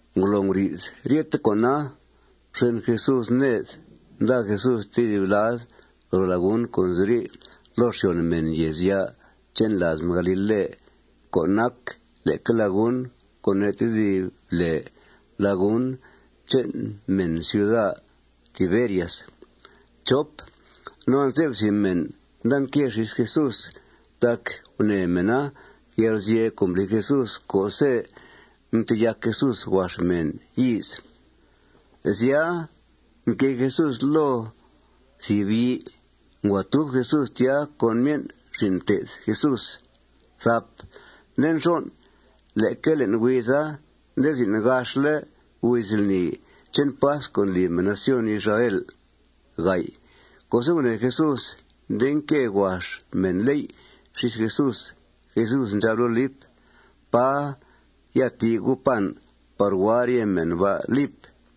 Ngolo nguri'th ryete con'a, mxen Jesús ned. Nda Jesús tedib lad ro lagun co' nziri' loo xyòn mèn yèezya' che'n làaz mèn galile co' nac leque lagun co' ne' tedib lèe lagun che'n mèn ciuda Tiberias. No anze'f thìb mèn nda nque xís Jesús tac gunèe mèna yalguzye' co' mbli Jesús co'se' mteyac Jesús huax mèn yíiz. Sya, mquée Jesús loo thìb yii. Ngua tub Jesús tya con myen' xin' mté'th Jesús. Nde nxon', leque le'n huiza nde zin' gaxle' huiz lni che'n pasc co' ndli mèn nación Israel. Co'se' gunèe Jesús nde nque huax mènléy' xís Jesús, Jesús ndxab loo Lip: ―¿Pá ya ti' gu' pan par hua rye mèn ba', Lip?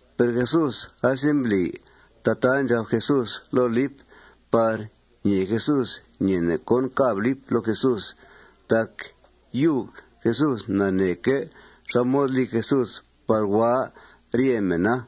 Per Jesús asembli tataa ndxab Jesús loo Lip par ñee Jesús ñeene' cón càb Lip loo Jesús. Tac yub Jesús naneeque' xá mod li Jesús par hua rye mèna.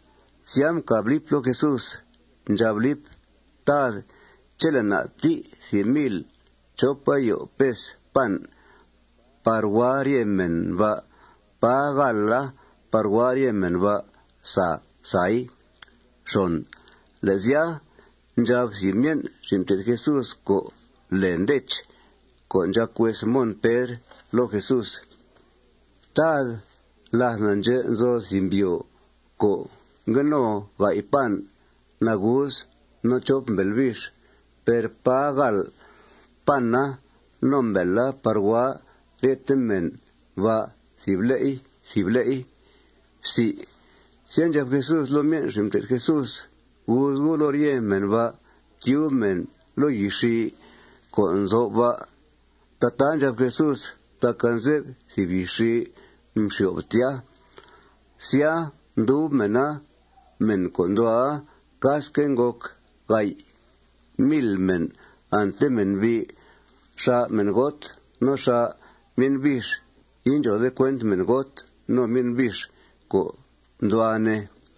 Sya, mcàb Lip loo Jesús. Ndxab Lip: ―Tad, chele' na' ti' thìb mil chop ayo pes pan par hua rye mèn ba', pà gàala par hua rye mèn ba' sa sai. Le' sya, ndxab thìb myen' xin' mté'th Jesús co' lèe Ndech, co' ndxàc hues Mon Pedr, loo Jesús: ―Tad, làth na' ndxè' nzo thìb mbyòo co' ngue no ga'y pan nagus no chop mbèel bix. Per pà gàal pana no mbèela par hua ryethe mèn ba' thìb le'i thìb le'i. Sya, ndxab Jesús loo myen' xin' mté'th Jesús: ―Guuz gu' loo rye mèn ba' tyub mèn loo yixii co' nzo'f ba'. Tataa ndxab Jesús tac anze'f thìb yixii mxyo'f tya. Sya, mdub mèna. Mèn co' nduhua, casque' ngòc ga'y mil mèn, ante mènbi'. Xà' mèngot. No xà' myen' bix. Indxòode cuent mèngot no myen' bix co' nduhua, ne.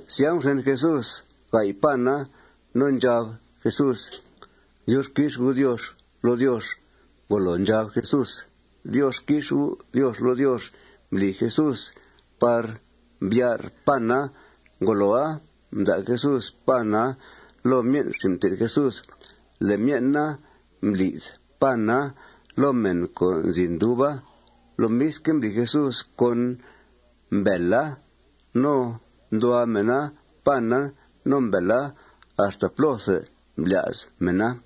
Sya, mxen Jesús ga'y pana. No ndxab Jesús: ―Diox quix U', Diox, loo Diox. Ngolo ndxab Jesús: Diox quix U', Diox, loo Diox, mbli Jesús par mbyar' pana. Ngoloa, mda' Jesús pana loo myen' xin' mté'th Jesús. Le' myen' na, mbli'th pana loo mèn co' nzi nduba. Lomisque' mbli Jesús con mbèela. No nduhua mèna pana no mbèela axta plóthe mblya's mèna.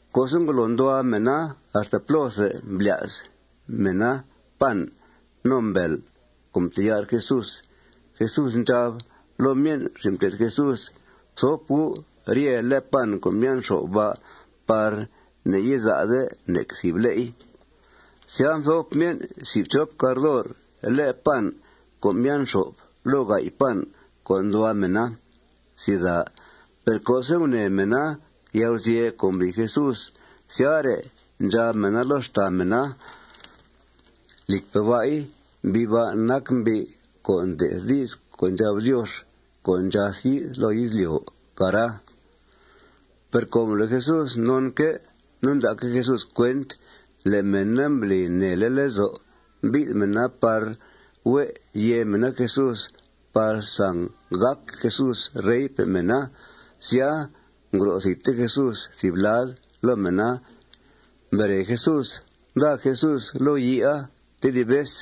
Co'se' ngolo nduhua mèna axta plóthe mblya's mèna pan no mbèel co' mteyar' Jesús, Jesús ndxab loo myen' xin' mté'th Jesús: ―Fthop gu' rye le' pan co' mbyan' xo'f ba' par ne'yiza'de nec thìb le'i. Sya, mthop myen' si' fchop cardor le' pan co' mbyan' xo'f loo ga'y pan co' nduhua mèna. Per co'se' gunèe mèna yalguzye' co' mbli Jesús, syare', ndxab mèna loo xtàa mèna: ―Lìcpe' ba'i, mbi' ba' nac mbi' co' nde'th di's co' ndxab Diox co' ndxath yi'th loo izlyo', cara. Per com le' Jesús nonque' no nda'que' Jesús cuent le' mèna mbli nèele' lezo' mbi'th mèna par hue' yèe mèna Jesús par sanggàc Jesús reype' mèna, sya, ngro' thidte Jesús thìb lad loo mèna. Mbere Jesús, nda Jesús loo yiia tedib vez.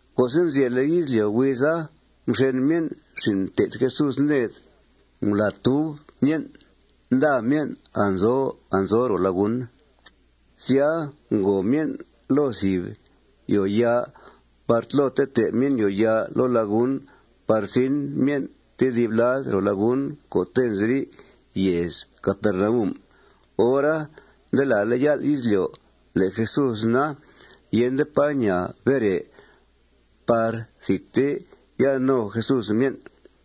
Co'se' mzyèle' izlyo' huiza, mxen myen' xin' mté'th Jesús ned. Ngulàa tùub myen'. Nda myen' anzo anzo ro lagun. Sya, ngòo myen' loo thìb yòoyaa par tlo tetee myen' yòoyaa loo lagun par zin myen' tedib lad ro lagun co'te' nziri' yèez Capernaum. Hora, nde làale' yál' izlyo'. Le' Jesús na, yende pá ñaa bere par thidte ya no Jesús myen'.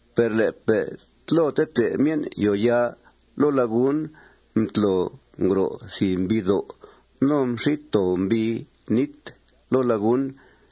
Per le'pe' tlo tetee myen' yòoyaa loo lagun, mtlo ngro' thìb mbiidó'. No mxít too mbii nít loo lagun.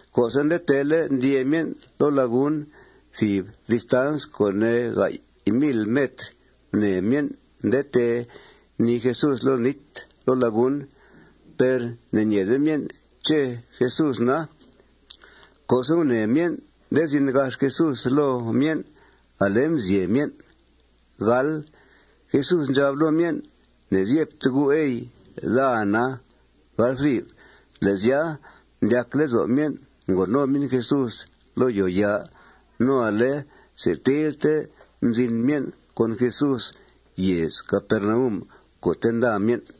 Co'se' nde teele' ndyee myen' loo lagun thìb distans co' ne' ga'y mil metr, gunèe myen' nde tee nii Jesús loo nít loo lagun. Per ne'ñeede myen' ché' Jesús na. Co'se' gunèe myen' nde zin gax Jesús loo myen', ale mzyeb myen'. Jesús ndxab loo myen': ―Ne'zyebte gu', ey. Daa na. Le' sya, mdyac lezo' myen' ngo no myen' Jesús loo yòoyaa. No ale setilte mzin myen' con Jesús yèez Capernaum co'te' nda myen'.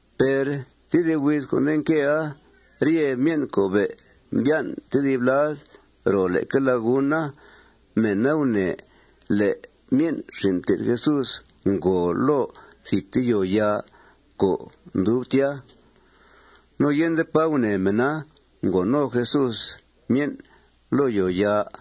Per tedib huiz co' nde nquea, rye mèn co' be' mbyan' tedib lad ro leque laguna, mèna gunèe le' myen' xin' mté'th Jesús ngòo loo thidte yòoyaa co' ndub tya. No yende pá gunèe mèna ngòo no Jesús myen' loo yòoyaa.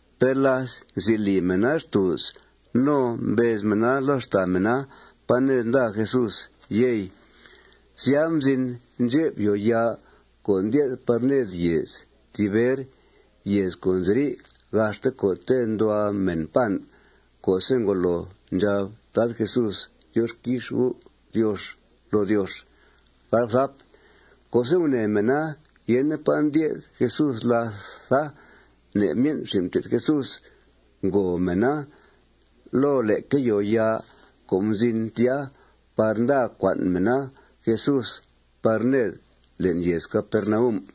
Per láth nzi li mèna xtùuz no mbez mèna loo xtàa mèna: ¿Pá ned nda Jesús, yey?, sya, mzin ndxep yòoyaa co' ndye'th par ned yèez Tiber, yèez co' nziri' gaxte co'te' nduhua mèn pan co'se' ngolo ndxab Tad Jesús: Diox quix U', Diox, loo Diox. Co'se' gunèe mèna yende pá ndye'th Jesús làtha, ne' myen' xin' mté'th Jesús, ngòo mèna loo leque yòoyaa co' mzin tya par nda cua'n mèna Jesús par ned le'n yèez Capernaum.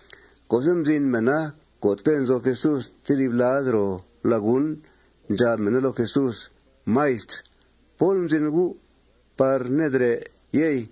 Co'se' mzin mèna co'te' nzo Jesús tedib lad ro lagun, ndxab mèna loo Jesús: ―Maistr, ¿pól mzin U' par nedrè', yey?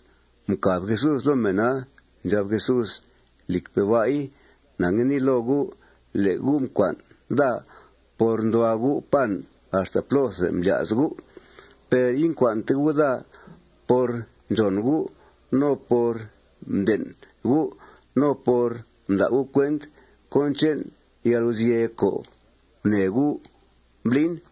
Mcàb Jesús loo mèna. Ndxab Jesús: ―Lìcpe' ba'i, na ngue nii loo gu': Le' gu' mcua'n daa por nduhua gu' pan axta plóthe mblya's gu'. Per incua'nte gu' daa por ndxòn gu', no por mden' gu', no por mda' gu' cuent cón che'n yalguzye' co' gunèe gu' mblin.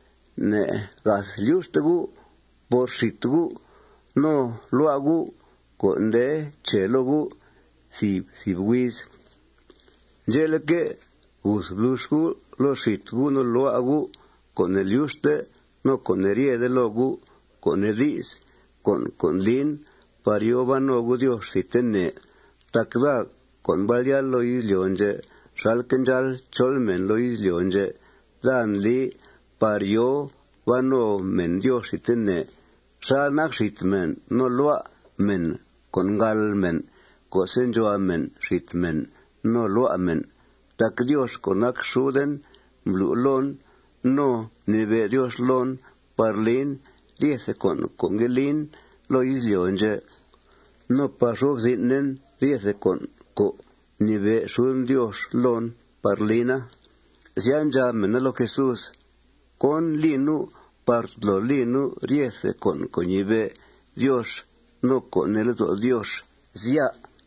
Ne'gath lyuxte gu' por xít gu' no lua' gu' co' nde che loo gu' thìb thìb huiz. Ndxe'leque', guth blux gu' loo xít gu' no lua' gu' co' ne'lyuxte no co' ne'ryede loo gu', co' nee di's, con' co' ndlin par yòo ban no gu' Diox thidtene. Tac daa co' mbal yáal loo izlyo' ndxè' xalque' ndxáal chol mèn loo izlyo' ndxè', daa ndli par yòo ban no mèn Diox thidtene xal nac xít mèn no lua' mèn co' ngàal mèn co'se' ndxuhua mèn xít mèn no lua' mèn. Tac Diox co' nac xuden mblu' loon no mnibe' Diox loon par lin ryethe con' co' ngue lin loo izlyo' ndxè' no par xo'f zin'en ryethe con' co' mnibe' xuden Diox loon par lina. Sya, ndxab mèna loo Jesús: ―¿Cón li nu' par tolo li nu' ryethe con' co' ñibe' Diox no co' nee lezo' Diox, sya?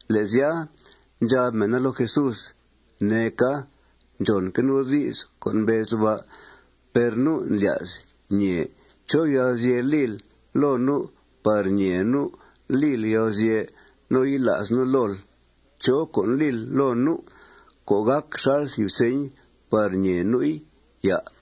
Le' sya, ndxab mèna loo Jesús: ―Neeca. Ndxònque' nu' di's co' mbezl ba'. Per nu' ndlya's ñèe chó yalguzye' lil loo nu' par ñèe nu' lil yalguzye' no yila's nu' lool. ¿Chó con' lil loo nu' co' gàc xal thìb señ par ñèe nu'i, à'?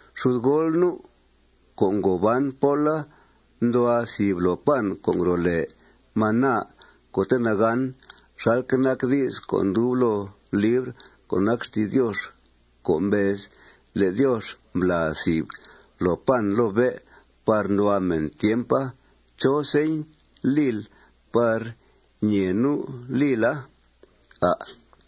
Xudgool nu' co' ngo ban póla nduhua thìb loo pan co' ngro' lèe maná co'te' nagán, xalque' nac di's co' ndub loo libr co' nac xti's Diox co' mbez le' Diox mblàa thìb loo pan loo bé' par nduhua mèn tiempa. ¿Chó señ lil par ñèe nu' lila, à'?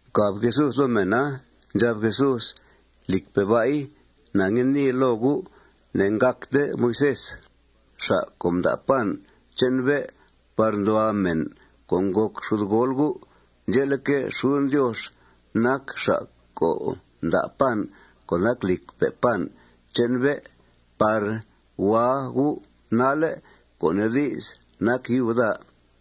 Mcàb Jesús loo mèna. Ndxab Jesús: ―Lìcpe' ba'i, na ngue nii loo gu': Ne'ngàcte Moisés xa' co' mda' pan che'n bé' par nduhua mèn co' ngòc xudgool gu'. Ndxe'leque', xuden Diox nac xa' co' nda' pan co' nac lìcpe' pan che'n bé' par hua gu' nalle', co' nee di's, nac yub daa.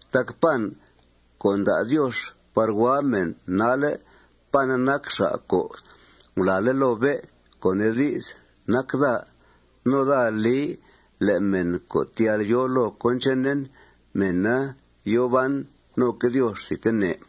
Tac pan co' nda' Diox par hua mèn nalle', pana nac xa' co' ngulàale' loo bé', co' nee di's, nac daa. No daa li le' mèn co' tyal yòo loo cón chenen, mèna yòo ban noque' Diox thidtene.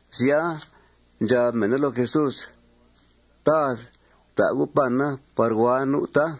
Sya, ndxab mèn loo Jesús: ―Tad, fta' U' pana par hua nu', tá.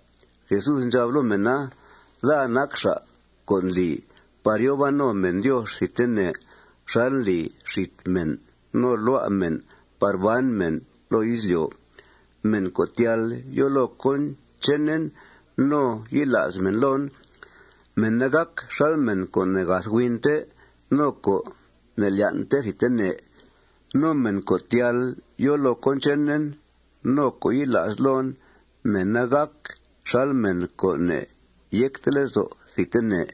Jesús ndxab loo mèna: ―Daa nac xa' co' ndli par yòo ban no mèn Diox thidtene xal ndli xít mèn no lua' mèn par ban mèn loo izlyo'. Mèn co' tyal yòo loo cón chenen no yila's mèn loon, mèna gàc xal mèn co' ne'gath huinte no co' ne'lyan'te thidtene. No mèn co' tyal yòo loo cón chenen no co' yila's loon, mèna gàc xal mèn co' ne'yecte lezo' thidtene.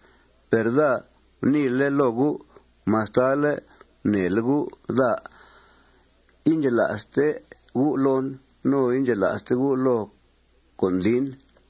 Per daa guniile' loo gu': Mastale' gunèele' gu' daa, indxela'ste gu' loon no indxela'ste gu' loo con' ndlin.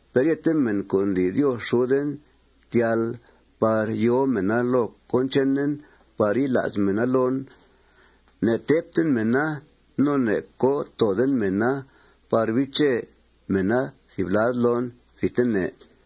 Per ryete mèn co' ndli Diox xuden tyal par yòo mèna loo cón chenen par yila's mèna loon, ne'tèbten mèna no ne'co' tooden mèna par biiche mèna thìb lad loon thidtene.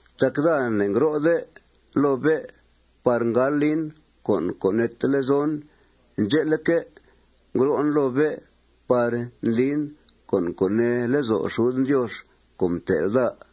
Tac daa ne'ngro'de loo bé' par ngal lin con' co' neete lezon. Ndxe'leque', ngro'en loo bé' par ndlin con' co' nee lezo' xuden Diox co' mtel' daa.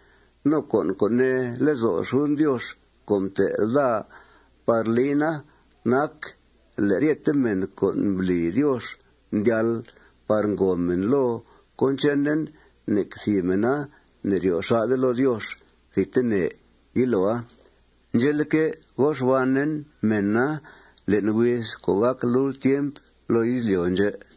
No con' co' nee lezo' xuden Diox co' mtel' daa par lina nac le' ryete mèn co' mbli Diox mdyal par ngòo mèn loo cón chenen, nec thìb mèna ne'ryo' xà'de loo Diox thidtene yiloa. Ndxe'leque', go xbanen mèna le'n huiz co' gàc lult tiemp loo izlyo' ndxè'.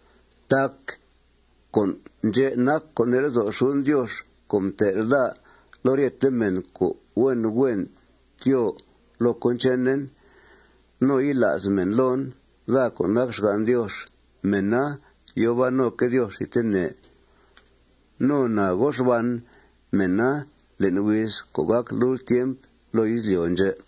Tac con' ndxè' nac co' nee lezo' xuden Diox co' mtel' daa le' ryete mèn co' huen huen tyóo loo cón chenen no yila's mèn loon, daa co' nac xgan' Diox, mèna yòo ban noque' Diox thidtene. No na go xban mèna le'n huiz co' gàc lult tiemp loo izlyo' ndxè'.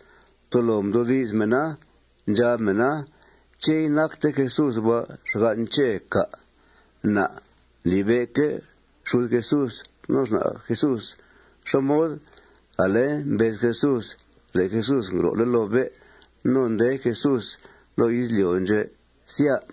Tolo mdoodi's mèna. Ndxab mèna: ―¿Ché' inacte Jesús ba' xgan' Chè, cà'? Na' ndlibe'que' xud Jesús no xna' Jesús. ¿Xá mod ale mbez Jesús le' Jesús ngro'le' loo bé' no nde Jesús loo izlyo' ndxè', sya?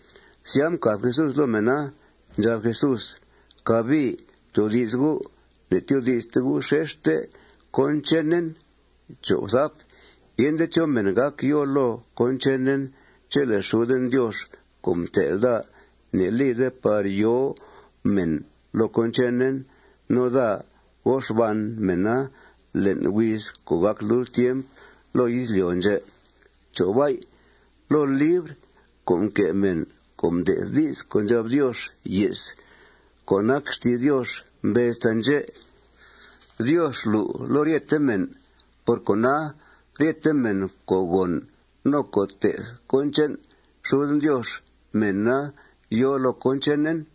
Sya, mcàb Jesús loo mèna. Ndxab Jesús: ―Cabii ftoodi's gu'. Ne'tyoodi'ste gu' xexte cón chenen. Yende chó mèn gác yòo loo cón chenen chele' xuden Diox co' mtel' daa ne'lide par yòo mèn loo cón chenen. No daa go xban mèna le'n huiz co' gàc lult tiemp loo izlyo' ndxè'. Loo libr co' mque' mèn co' mde'th di's co' ndxab Diox ye's co' nac xti's Diox mbez taandxè': Diox lu' loo ryete mèn. Por cona, ryete mèn co' gòn no co' té'th cón che'n xuden Diox, mèna yòo loo cón chenen.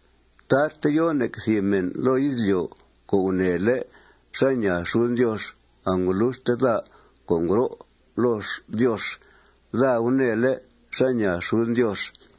Tarte yo nec thìb mèn loo izlyo' co' gunèele' xá ñaa xuden Diox. Angoluxte daa co' ngro' loo Diox, daa gunèele' xá ñaa xuden Diox.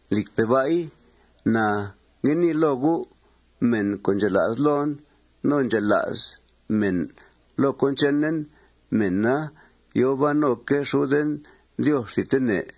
Lìcpe' ba'i, na ngue nii loo gu': Mèn co' ndxela's loon no ndxela's mèn loo cón chenen, mèna yòo ban noque' xuden Diox thidtene.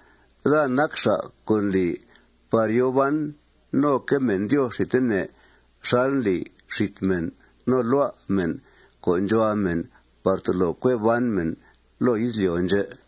Daa nac xa' co' ndli par yòo ban noque' mèn Diox thidtene xal ndli xít mèn no lua' mèn co' ndxuhua mèn par tolo cue ban mèn loo izlyo' ndxè'.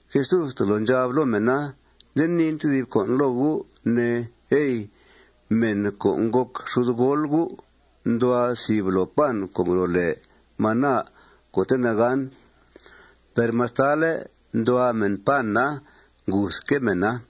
Jesús tolo ndxab loo mèna: ―Nde niin thìb con' loo gu', ne, ey: Mèn co' ngòc xudgool gu' nduhua thìb loo pan co' ngro' lèe maná co'te' nagán. Per mastale' nduhua mèna pana, nguthque' mèna.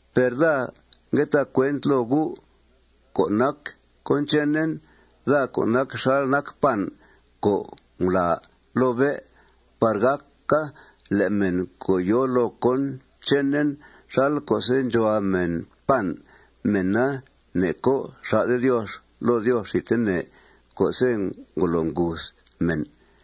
Per daa ngue ta cuent loo gu' co' nac cón chenen, daa co' nac xal nac pan co' ngulàa loo bé' par gàca le' mèn co' yòo loo cón chenen, xal co'se' ndxuhua mèn pan, mèna ne'co' xà'de Diox loo Diox thidtene co'se' ngolo nguth mèn.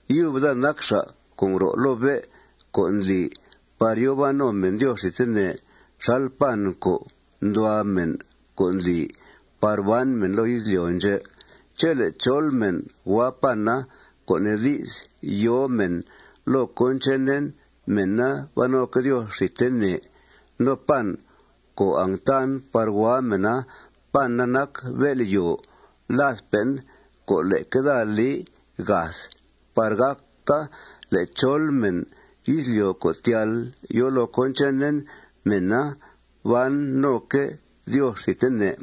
Yub daa nac xa' co' ngro' loo bé' co' ndli par yòo ban no mèn Diox thidtene xal pan co' ndxuhua mèn co' ndli par ban mèn loo izlyo' ndxè'. Chele' chol mèn hua pana, co' nee di's, yòo mèn loo cón chenen, mèna ban noque' Diox thidtene. No pan co' angtan par hua mèna, pana nac bél'yòo ladpe'en co' leque daa li gath par gàca le' chol mèn izlyo' co' tyal yòo loo cón chenen, mèna ban noque' Diox thidtene.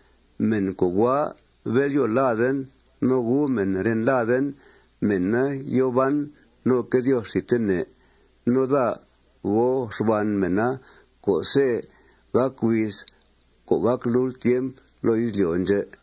Mèn co' hua bél'yòo laden no gu mèn ren laden, mèna yòo ban noque' Diox thidtene. No daa go xban mèna co'se' gàc huiz co' gàc lult tiemp loo izlyo' ndxè'.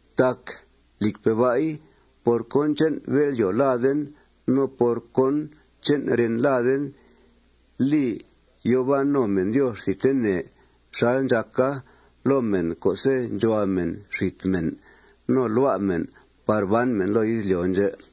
Tac, lìcpe' ba'i, por cón che'n bél'yòo laden no por cón che'n ren laden li yòo ban no mèn Diox thidtene xal ndxàca loo mèn co'se' ndxuhua mèn xít mèn no lua' mèn par ban mèn loo izlyo' ndxè'.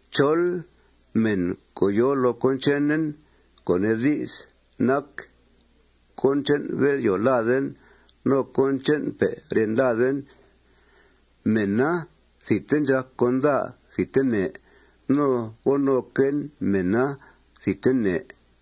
Chol mèn co' yòo loo cón chenen, co' nee di's, nac cón che'n bél'yòo laden no cón che'npe' ren laden, mèna thidte ndxàc con daa thidtene. No go noquen mèna thidtene.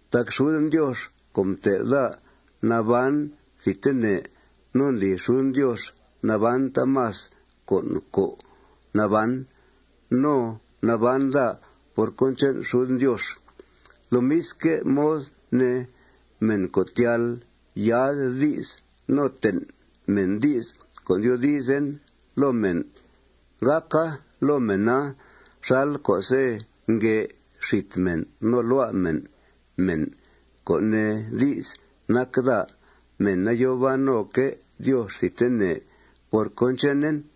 Tac xuden Diox co' mtel' daa naban thidtene no ndli xuden Diox naban taamas con' co' naban. No naban daa por cón che'n xuden Diox. Lomisque' mod ne, mèn co' tyal yaa'd di's no ten' mèn di's co' ndyoodizen loo mèn, gàca loo mèna xal co'se' nguè' xít mèn no lua' mèn mèn, co' nee di's, nac daa, mèna yòo ban noque' Diox thidtene por cón chenen.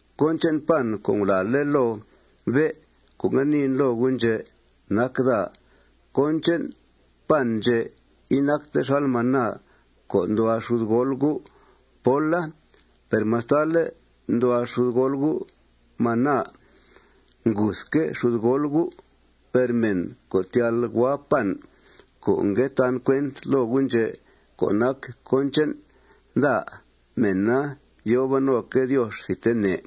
Cón che'n pan co' ngulàale' loo bé' co' ngue niin loo gu' ndxè', nac daa. Cón che'n pan ndxè' inacta xal maná co' nduhua xudgool gu' póla. Per mastale' nduhua xudgool gu' manaa, nguthque' xudgool gu'. Per mèn co' tyal hua pan co' ngue tan cuent loo gu' ndxè' co' nac cón che'n daa, mèna yòo ban noque' Diox thidtene.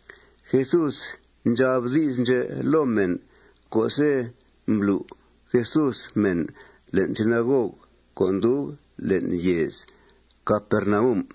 Jesús ndxab di's ndxè' loo mèn co'se' mblu' Jesús mèn le'n sinagog co' ndub le'n yèez Capernaum.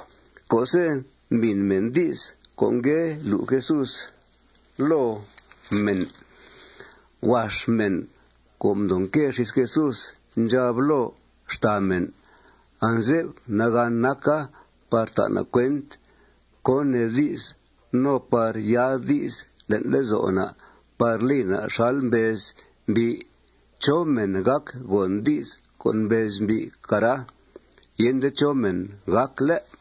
Co'se' mbìn mèn di's co' ngue lu' Jesús loo mèn, huax mèn co' mdoo nque xís Jesús ndxab loo xtàa mèn: ―Anze'f nagàn naca par ta' na' cuent cón nee di's no par yaa'd di's le'n lezo' na' par li na' xal mbez mbi'. ¿Chó mèn gác gòn di's co' mbez mbi', cara? Yende chó mèn gác, ¿lé'?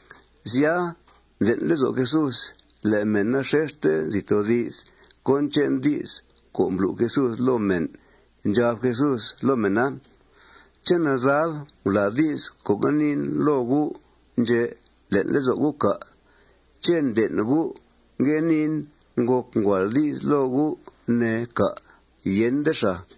Sya, mden' lezo' Jesús le' mèna xexte nzi toodi's cón che'n di's co' mblu' Jesús loo mèn. Ndxab Jesús loo mèna: ―¿Ché' nazab ngulàa di's co' ngue niin loo gu' ndxè' le'n lezo' gu', cà'? ¿Ché' nden' gu' ngue niin ngòc nguàal di's loo gu', ne, cà'? Yende xàa.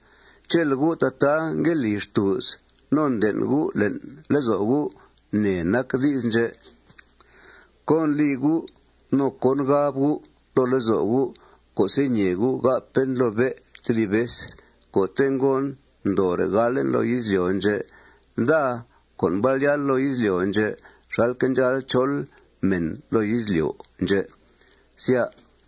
Chele' gu' tataa ngue li xtùuz no nden' gu' le'n lezo' gu' nè nac di's ndxè', ¿cón li gu' no cón gab gu' loo lezo' gu' co'se' ñèe gu' gápen loo bé' tedib vez co'te' ngon ndoore' galen loo izlyo' ndxè', daa co' mbal yáal loo izlyo' ndxè' xalque' ndxáal chol mèn loo izlyo' ndxè', sya?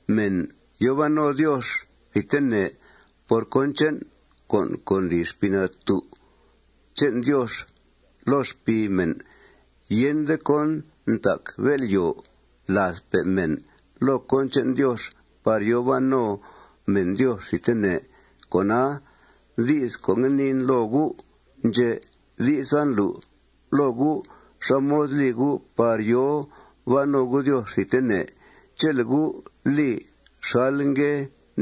Mèn yòo ban no Diox thidtene por cón che'n con' co' ndli Xpii Natú' che'n Diox loo xpii mèn. Yende cón ntac bél'yòo ladpe' mèn loo cón che'n Diox par yòo ban no mèn Diox thidtene. Cona, di's co' ngue niin loo gu' ndxè', di'sa ndlu' loo gu' xá mod li gu' par yòo ban no gu' Diox thidtene. Chele' gu' li xal ngue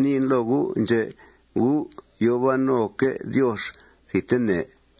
niin loo gu' ndxè', gu' yòo ban noque' Diox thidtene.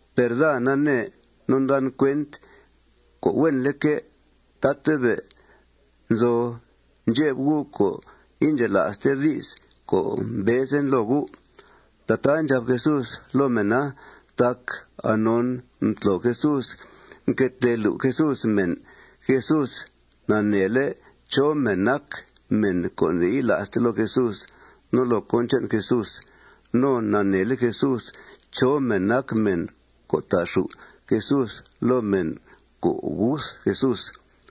Per daa nanee no ndan cuent co' huenleque' tatabe' nzo ndxep gu' co' indxela'ste di's co' mbezen loo gu'. Tataa ndxab Jesús loo mèna tac anon mtlo Jesús, mque tee lu' Jesús mèn, Jesús naneele' chó mèn nac mèn co' ne'yila'ste loo Jesús no loo cón che'n Jesús. No naneele' Jesús chó mèn nac mèn co' ta'xù' Jesús loo mèn co' guth Jesús.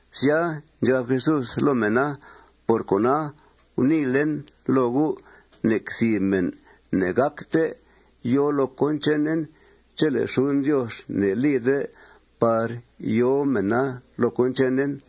Sya, ndxab Jesús loo mèna: ―Por cona, guniilen loo gu' nec thìb mèn ne'gácte yòo loo cón chenen chele' xuden Diox ne'lide par yòo mèna loo cón chenen.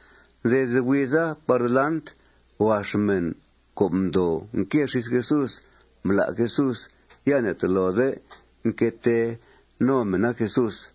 Desde huiza par delant, huax mèn co' mdoo nque xís Jesús mblá' Jesús. Ya ne'tolode nque tee no mèna Jesús.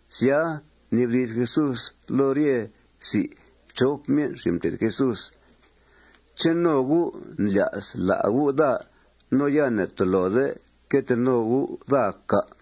Sya, mnibdi's Jesús loo rye si' fchop myen' xin' mté'th Jesús: ―¿Ché' no gu' ndlya's lá' gu' daa no ya ne'tolode que tee no gu' daa, cà'?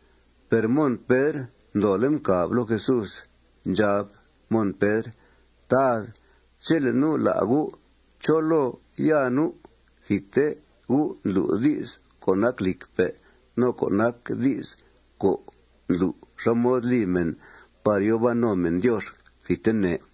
Per Mon Pedr ndoole' mcàb loo Jesús. Ndxab Mon Pedr: ―Tad, chele' nu' lá' U', ¿chó loo ya nu'? Thidte U' ndlu' di's co' nac lìcque' no co' nac di's co' ndlu' xá mod li mèn par yòo ban no mèn Diox thidtene.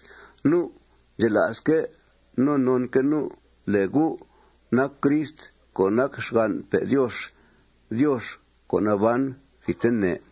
Nu' ndxela'sque' no nonque' nu' le' U' nac Crist co' nac xgan'pe' Diox, Diox co' naban thidtene.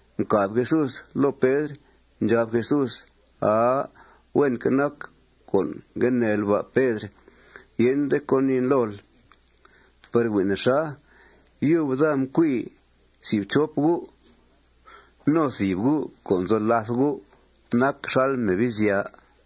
Mcàb Jesús loo Pedr. Ndxab Jesús: ―Aa. Huenque' nac co' ngue neel ba', Pedr. Yende cón niin lool. Per hui' nexa. Yub daa mcui si' fchop gu'. No thìb gu' co' nzo làth gu' nac xal Mebizya.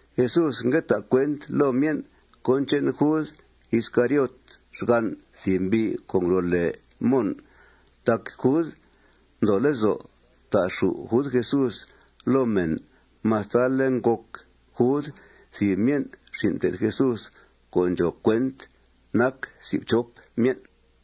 Jesús ngue ta' cuent loo myen' cón che'n Jud Iscariot, xgan' thìb mbi' co' ngro' lèe Mon. Tac Jud mdoo lezo' ta'xù' Jud Jesús loo mèn mastale' ngòc Jud thìb myen' xin' mté'tth Jesús co' ndxòo cuent nac si' fchop myen'.